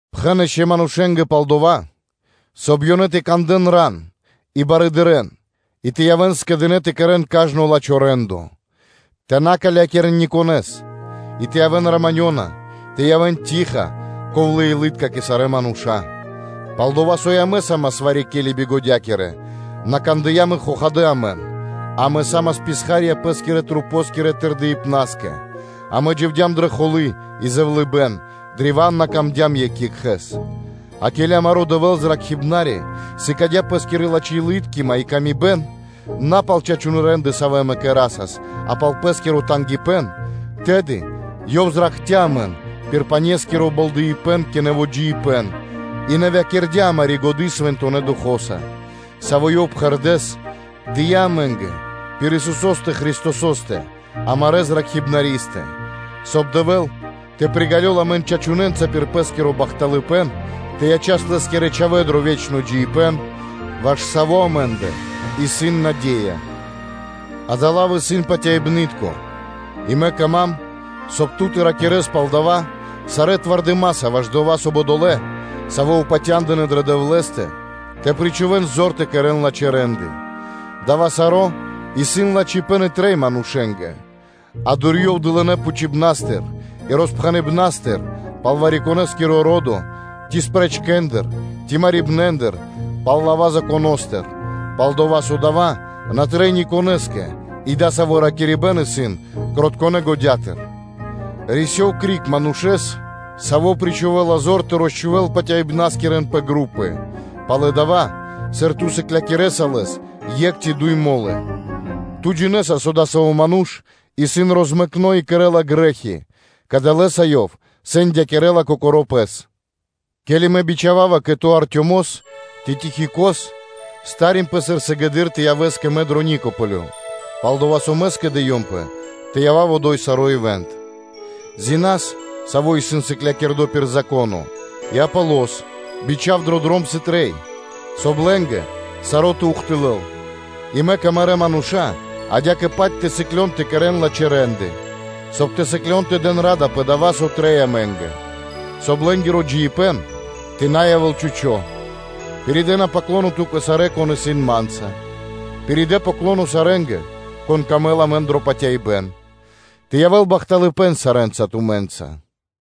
Пхэн ишчо (инкэ́) манушэ́нгэ пал дова́, соб (кай) ёнэ тэ кандэ́н ран и барыдырэ́н, и тэ явэ́н скэдынэ́ тэ кэрэ́н кажно лачхо́ рэ́ндо (де́ло); тэ на калякирэн никонэ́с, а тэ явэ́н раманёнэса (мирнонэса), тэ явэ́н штыл (тиха), ковлэ́-илы́тка кэ сарэ́ мануша́. Пал-дова́ со и амэ са́мас вари-ке́ли бигодякирэ, на кандыям и амэн; амэ са́мас писха́рья пэ́скирэ-масэнгирэ тырдыпнаскэ, амэ дживдям дро холы́ и зэвлыныпэ́н, древа́н бидыкхцям екх екхэ́с. А ке́ли амаро́ Дэвэ́л, Зракхибнари, сыкадя́ Пэ́скири лачхэ́-илы́ткима и ла́ска, на пал чачунэ́ рэ́нды, савэ́ амэ кэрасас, а пал Пэ́скиро тангипэ́н, тэды Ёв зракхця́ амэн пир панескиро болдэипэн кэ нэво́ джиибэ́н и нэвякирдя амари́ годы́ Свэнтонэ́ Духо́са, Саво́ Ёв пхэрдэ́с дыя́ амэ́нгэ пир Исусо́стэ Христосо́стэ, амарэ́ Зракхибнаристэ, соб (кай) Дэвэ́л тэ приґалёл амэн чачунэнца пир Пэ́скиро бахталыпэ́н тэ ячас Лэ́скирэ чхавэ́нца дро ве́чно джиибэ́н, ваш саво́ амэ́ндэ исын наде́я. Дава́ лав исын патяибны́тко, и мэ кама́м, соб (кай) ту тэ ракирэ́с пал дава́ сарэ́ зорья́са дро ду́хо (фа́но) ваш дова́, соб (кай) одолэ́, савэ́ упатя́ндынэ дрэ Дэвлэ́стэ, причхувэ́н зор тэ кэрэ́н лачхэ́ рэ́нды. Дава́ саро́ исын лачхипэ́н и трэй манушэ́нгэ. Джа́ криг (дурьёв) дурэды́р дылынэ́ пхучибнэндыр и роспхэныбнэндыр пал вари-конэ́скиро ро́до, ци спрэчкэндыр ци марибнэндыр пал лава́ Законо́стыр; пал-дова́ со дава́ на трэй ни конэ́скэ и дасаво ракирибэ́н исын кротконэ годятыр. Рисёв криг манушэ́стыр, саво́ причхувэла зор тэ розчхувэл патяибнаскирэн пэ групы пало́ (после) дава́, сыр ту сыклякирэса лэс екх ци дуй мо́лы, ту джинэ́са со адасаво́ ману́ш исын розмэкно и кэрэ́ла грэ́хи, кадалэса ёв сэндякирэ́ла кокоро́ пэс. Ке́ли мэ бичхава́ва кэ ту Артёмос ци Тихикос, прилэ́ зор сыр сыгэды́р тэ явэс кэ мэ дро Никаполё, пал-дова́ со мэ скэдыёмпэ тэ явав одо́й саро́ ивант (зима). Зинас, саво́ исын сыклякирдо пир Зако́но, и Аполос, бичха́в дро дром сыр трэй, соб (кай) лэ́нгэ саро́ тэ ухтылэл; и мэк амарэ́ мануша́ адя́кэ-паць тэ сыклён тэ кэрэ́н лачхэ́ рэ́нды, соб (кай) тэ сыклён тэ дэн ра́да пэ дава́, со трэй амэ́нгэ, соб (кай) лэ́нгиро джиибэ́н тэ на явэ́л чхучо́. Пиридэна “паклоно” ту́кэ сарэ́, кон исын ма́нца. Пиридэ “паклоно” сарэ́нгэ, конэ́скэ сам дро́га амэ дро патяибэ́н. Тэ явэ́л бахталыпэ́н сарэ́нца тумэ́нца. Ами́нь.